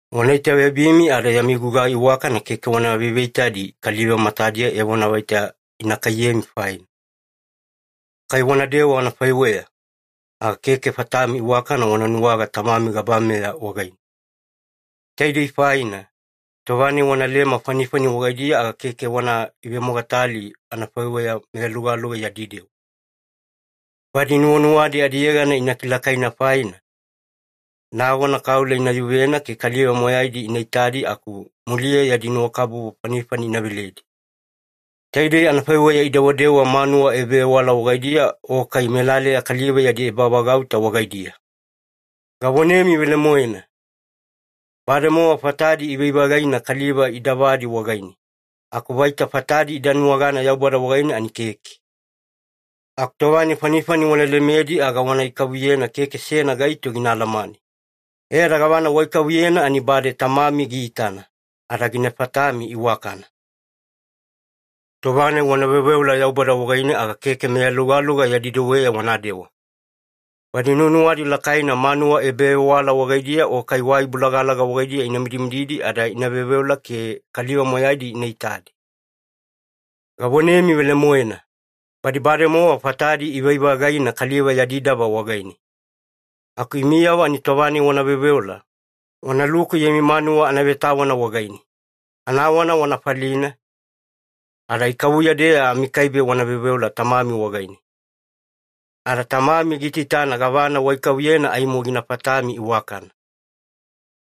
“Wana itaveyabimi ada yami gugai iwakana keke wana veveitadi kaliva matadiya evona vaita ina kaiyemi faina. Kai wanadewa anafaiweya, aga keke fatami iwakana wana nuwaga Tamami gabameya wagaine. Taidei faina, tova-nai wanalema fanifani wagaidiya, aga keke wana ivemogatali anafaiweya meyalugaluga yadi dewa. Badi nuwanuwadi adiyegana ina kilakaina faina, nagona kaula ina yuvena ke kaliva moyaidi ina itadi, aku muliya yadi nuwakabubu fanifani ina veledi. Taidei anafaiweya idewadewa manuwa ebavewala wagaidiya o kai melaleya kaliva yadi ebavagauta wagaidiya. Gavonemi velemoena, bademowa fatadi ivai-vagaina kaliva idavadi wagaine, aku vaita fatadi ida nuwagana Yaubada wagaine ani keke. Aku tova-nai fanifani wana lemedi, aga wana ikavuyena keke seyana gaito gina alamane. E ada gavana waikavuyena ani bade Tamami giitana, ada gina fatami iwakana. “Tova-nai wana veoveola Yaubada wagaine, aga keke meyalugaluga yadi deweya wanadewa. Badi nuwanuwadi lakaina manuwa ebavewala wagaidiya o kai wai bolagalaga wagaidiya ina mididi ada ina veoveola ke kaliva moyaidi ina itadi. Gavonemi velemoena, badi bademowa fatadi ivai-vagaina kaliva yadi dava wagaine. Aku imiyavo ani tova-nai wana veoveola, wanaluku yami manuwa anavetawana wagaine, anawana wana falina, ada ikavuya-deya amikaibe wana veoveola Tamami wagaine. Ada Tamami giitaitana gavana waikavuyena ani aimo gina fatami iwakana.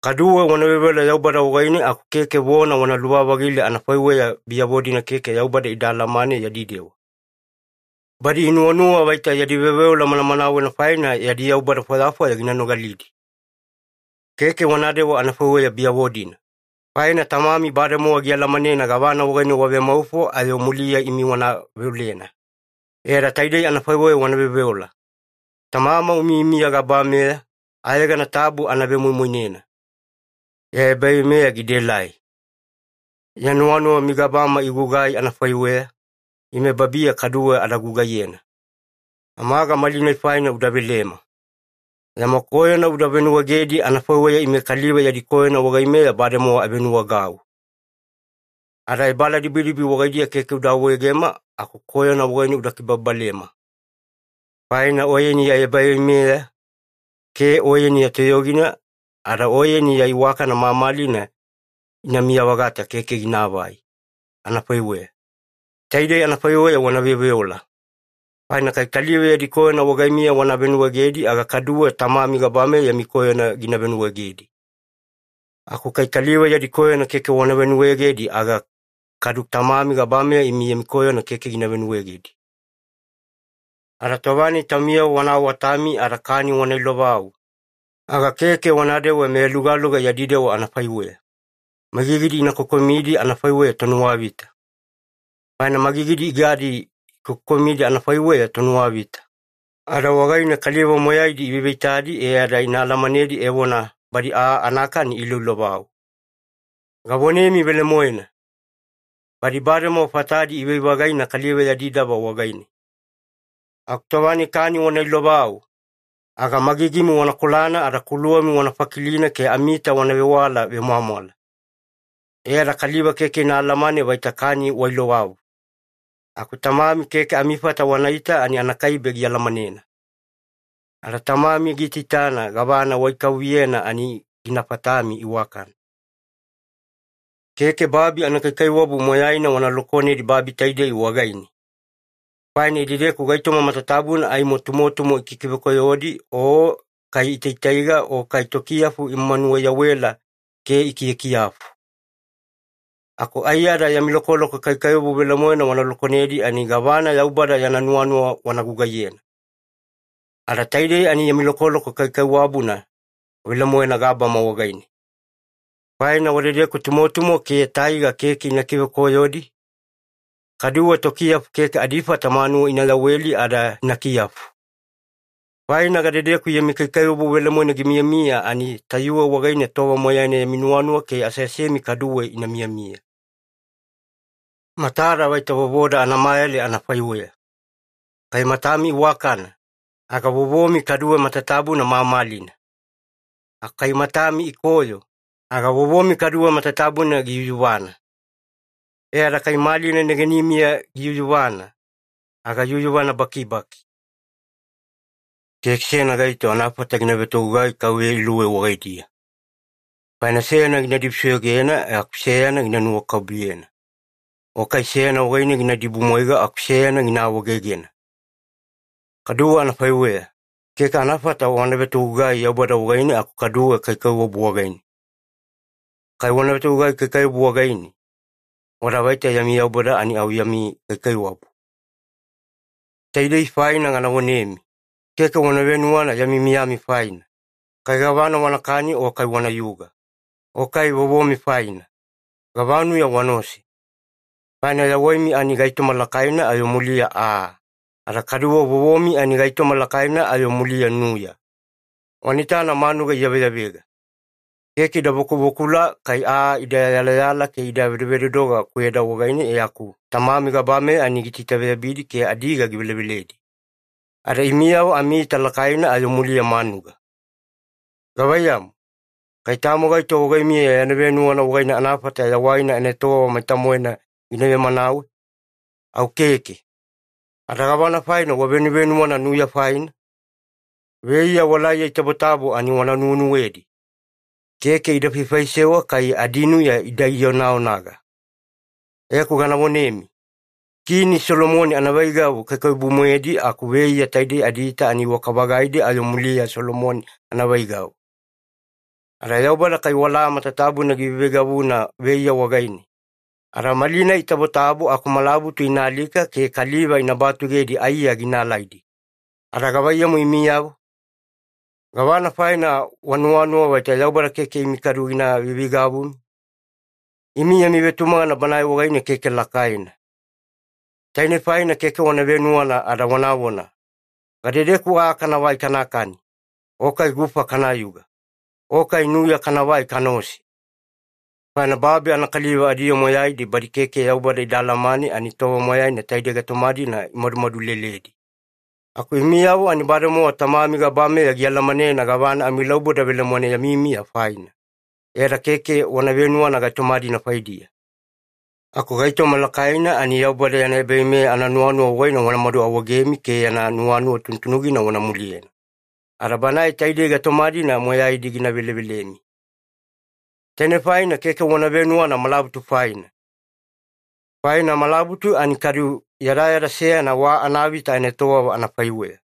Kaduwe wana veoveola Yaubada wagaine, aku keke vona wana luvavagile anafaiweya biyavo-dina keke Yaubada ida alamane yadi dewa. Badi inuwanuwa vaita yadi veoveola manamanawena faina, yadi yaubada fwayafwaya gina nogalidi. Keke wanadewa anafaiweya biyavo-dina, faina Tamami bademowa gialamanena gavana wagaine wavemaufo ayo muliya imi wana veolena. E ada taidei anafaiweya wana veoveola, ‘Tamama umiyamiya gabameya, ayegana tabu ana vemoimoinena. Ya ebaveimeya gidaelai. Ya nuwanuwa migabama igugai anafaiweya, ime babiya kaduwe ada gugaiyena. Amaga malinai faina uda velema. Yama koyona uda venuwaegedi anafaiweya ime kaliva yadi koyona wagaimeya bademowa avenuwaegau. Ada ebaaladibidibi wagaidiya keke uda awaegema, aku koyona wagaine uda kibababalema. Faina Oyeni ya ebaveimeya, ke Oyeni ya toyogina, ada Oyeni ya iwakana mamalina inamiya-vagata keke ginaavai. Anafaiweya.’ Taidei anafaiweya wana veoveola. Faina kai kaliva yadi koyona wagaimiya wana venuwaegedi, aga kaduwe Tamami gabameya yami koyona gina venuwaegedi. Aku kai kaliva yadi koyona keke wana venuwaegedi aga, kadu Tamami gabameya imi yami koyona keke gina venuwaegedi. “Ada tova-nai taumiyavo wana awatami ada kani wana ilovau, aga keke wanadewa meyalugaluga yadi dewa anafaiweya, magigidi ina kokomidi anafaiweya tonuwavita. Faina magigidi igadi ikokokomidi anafaiweya tonuwavita, ada wagaine kaliva moyaidi iveveitadi e ada ina alamanedi evona badi aa anakani iiloilovau. Gavonemi velemoena, badi bademowa fatadi ivai-vagaina kaliva yadi dava wagaine. Aku tova-nai kani wana ilovau, aga magigimi wana kolana ada kuluwami wana fakilina ke amiita wana vewala vemwamwala, e ada kaliva keke ina alamane vaita kani wailovau. Aku Tamami keke amifata wanaita ani anakaibe gialamanena. Ada Tamami giitaitana gavana waikavuyena ani gina fatami iwakana. “Keke babi anakaikaiwabu moyaina wana lokonedi babi taidei wagaine, faina idedeku gaitoma matatabuna ani tumotumo ikikivekoyodi, o kai itaitaiga, o kai tokiyafu imanuwa-iyawela ke ikiyakiyafu. Aku aiyada yami lokoloko kaikaiwabu velemoena wana lokonedi ani gavana Yaubada yana nuwanuwa wana gugaiyena. Ada taidei ani yami lokoloko kaikaiwabuna velemoena gabama wagaine. Faina wadedeku tumotumo ke taiga keke ina kivekoyodi, kaduwe tokiyafu keke adifata manuwa ina yaweli ada ina kiyafu. Faina gadedeku yami kaikaiwabu velemoena gimiyamiya, ani tayuwe wagaine tova moyaina yami nuwanuwa ke aseasemi kaduwe ina miyamiya. “Matada vaita vovoda anamayale anafaiweya. Kai matami iwakana, aga vovomi kaduwe matatabuna mamalina. Aku kai matami ikoyo, aga vovomi kaduwe matatabuna giyuyuvana. E ada kai malina negenimiya giyuyuvana, aga yuyuvana bakibaki. “Keke seyana gaito anafata gina vetogugai kauveya iluwei wagaidiya. Faina seyana gina dibusoyogena aku seyana gina nuwakabubuyena, o kai seyana wagaine gina idibumwaiga aku seyana gina awaegegena. Kaduwe anafaiweya, keke anafata wana vetogugai Yaubada wagaine aku kaduwe kaikaiwabu wagaine. Kai wana vetogugai kaikaiwabu wagaine, wada vaita yami yaubada ani au yami kaikaiwabu. “Taidei faina gana vonemi, keke wana venuwana yami miyami faina, kai gavana wanakani o kai wanayuga, o kai vovomi faina, gavanuya wanaose. Faina yawaimi ani gaitoma lakaina ayo muliya aa. Ada kaduwe vovomi ani gaitoma lakaina ayo muliya nuya. Wana itana manuga iyaveyavega. Keke ida bakubakula kai aa ida iyaiyala ke ida vedovedodoga kweda wagaine, e aku Tamami gabameya ani giitaitaveyabidi ke adiga giveleveledi. Ada imiyavo amiita lakaina ayo muliya manuga. Gavaiyamu, kai tamo gaito wagaimiya yana venuwana wagaine anafata yawaina anaetowava maita-moena gina vemanawe? Au keke. Ada gavana faina wavevenuwana nuya faina? Veiya walaiya itabotabo ani wana nuwenuwedi. Keke ida faifaisewa kai adinuya ida ionaonaga e aku gana vonemi, Kini Solomoni anaveigavu kaikaiwabu-moedi, aku veiya taidei adiita ani iwaka-vagaidi ayo muliya Solomoni anaveigavu. Ada Yaubada kai wala matatabuna giveiveigavuna veiya wagaine, ada malinai itabotabo aku malabutu ina alika ke kaliva ina batugedi aiya gina alaidi, aga gavaiyamu imiyavo? Gavana faina wanuwanuwa vaita Yaubada keke imi kaduwe gina veiveigavumi? Imi yami vetumagana Banae wagaine keke lakaina. Tainei faina keke wana venuwana ada wanavona, ‘Gadedeku aa kanavai kanakani, o kai gufa kanayuga, o kai nuya kanavai kanaose?’ Faina babi anakaliva adiyoo moyaidi badi keke Yaubada ida alamane, ani tova moyaina taidei gaitoma-dina imadumadu leledi. Aku imiyavo ani bademowa Tamami gabameya gialamanena gavana amilauboda velemoena yami miya faina, e ada keke wana venuwana gaitoma-dina faidiya. Aku gaitoma lakaina, ani Yaubada yana ebaveimeya ananuwanuwa wagaine wanamadu awaegemi ke yana nuwanuwa tunutunugina wana muliyena, ada Banae taidei gaitoma-dina moyaidi gina velevelemi. Tainei faina keke wana venuwana malabutu faina. Faina malabutu ani kadu yadayada seyana wa anavita anaetowava anafaiweya,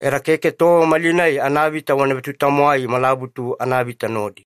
e ada keke tova malinai anavita wana vetutamwai malabutu anavita nodi.